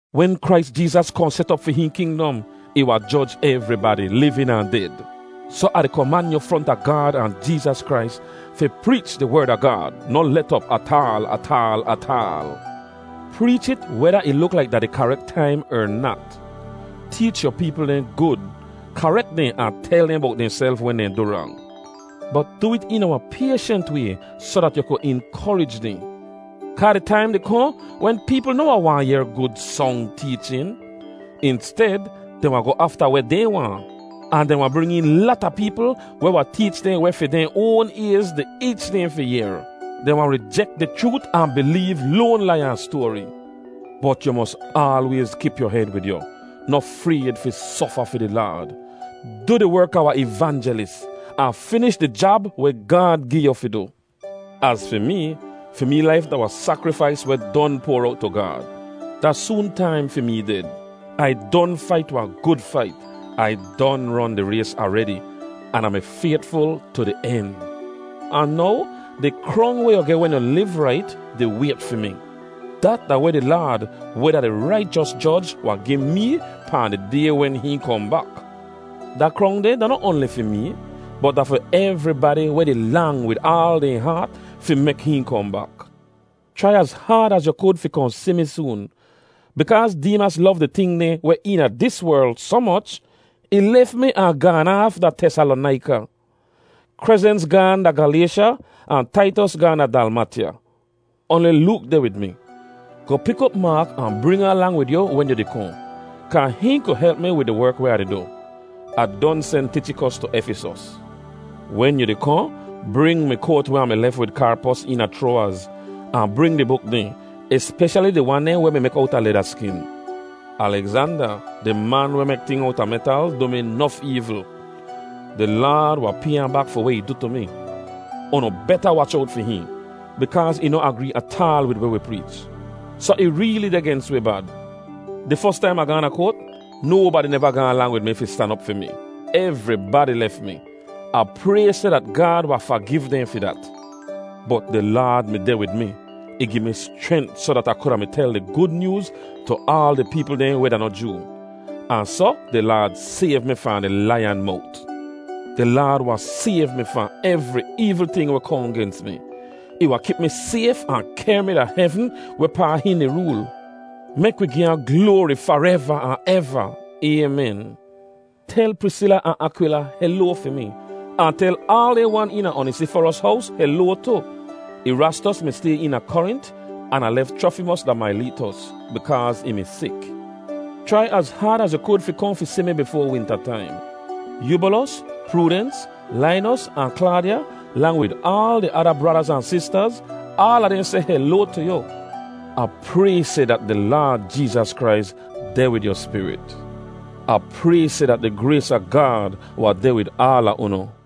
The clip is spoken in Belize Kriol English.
Wen Krais Jeezas kohn set op fi hihn kingdom, ih wahn joj evribadi, livin ahn ded. Soh Ah di koman yu fronta Gaad ahn Jeezas Krais fi preech di Werd a Gaad. Noh let op ataal ataal ataal. Preech it weda ih luk laik da di karek taim er nat. Teech yu peepl dehn gud; karek dehn ahn tel dehn bowt dehnself wen dehn du rang. Bot du it eena wahn payshent way soh dat yu ku inkorij dehn. Kaa di taim di kohn wen peepl noh wahn waahn yehr gud song teechin. Insted, dehn wahn goh afta weh dehn waahn, ahn dehn wahn bring een lata peepl weh wahn teech dehn weh fi dehn oan ayz di eech dehn fi yehr. Dehn wahn rijek di chroot ahn bileev loan lai-an-stoari. Bot yu mos aalwayz kip yu hed wid yu. Noh frayd fi sofa fi di Laad. Du di werk a wahn ivanjelis, ahn finish di jab weh Gaad gi yu fi du. Az fi mee, fi mee laif da wahn sakrifais weh don poar owt tu Gaad. Da soon taim fi mee ded. Ai don fait wahn gud fait. Ai don ron di rays aredi, an Ah mi faytful tu di en. Ahn now, di krong weh yu geh wen yu liv rait di wayt fi mi. Dat da weh di Laad, weh da di raichos Joj, wahn gi mee pahn di Day wen hihn kohn bak. Da krong deh da noh oanli fi mee, bot da fi evribadi weh di lang wid aal dehn haat fi mek hihn kohn bak. Chrai az haad az yu kud fi kohn si mi soon. Bikaaz Deemas lov di ting dehn weh eena dis werl soh moch, ih lef mi ahn gaan aaf da Tesalonaika. Krezens gaahn da Galaysha, ahn Taitos gaahn da Dalmatya. Oanli Look deh wid mi. Goh pik op Maak ahn bring ahn lang wid yu wen yu di kohn, kaa hihn ku help mi wid di werk weh Ah di du. Ah don sen Tichikos tu Efisos. Wen yu di kohn, bring mi koat weh Ah mi lef wid Karpos eena Chroawaz, ahn bring di buk dehn, espeshali di wan dehn weh mi mek owta leda skin. Alegzanda, di man weh mek ting owta metal du mi nof eevl. Di Laad wahn pay ahn bak fi weh ih du tu mi. Unu beta wach owt fi hihn, bikaaz ih noh agree ataal wid weh wi preech, soh ih reeli deh gens wi bad. Di fos taim Ah gaahn da koat, nobadi neva gaahn lang wid mi fi stan op fi mi. Evribadi lef mi. Ah pray seh dat Gaad wahn fagiv dehn fi dat. Bot di Laad mi deh wid mi. Ih gi mi schrent soh dat Ah kuda mi tel di Gud Nyooz tu aal di peepl dehn weh da noh Joo. Ahn soh di Laad sayv mi fahn di laiyan mowt. Di Laad wahn sayv mi fahn evri eevl ting weh kohn gens mi. Ih wahn kip mi sayf ahn kehr mi da hevn wehpaa hihn di rool. Mek wi gi ahn gloari fareva ahn eva! Aymen. Tel Prisila ahn Akwila heloa fi mi, ahn tel aal dehn wan eena Onisiforos hows heloa tu. Erastos mi stay eena Korint, an Ah lef Chrofimos da Maileetos, bikaaz ih mi sik. Chrai az haad az yu kud fi kohn fi si mi bifoa winta taim. Yubolos, Prudens, Lainos, ahn Klaadya, lang wid aal di ada bradaz ahn sistaz, aala dehn seh heloa tu yu. Ah pray seh dat di Laad Jeezas Krais deh wid yu spirit. Ah pray seh dat di grays a Gaad wahn deh wid aala unu.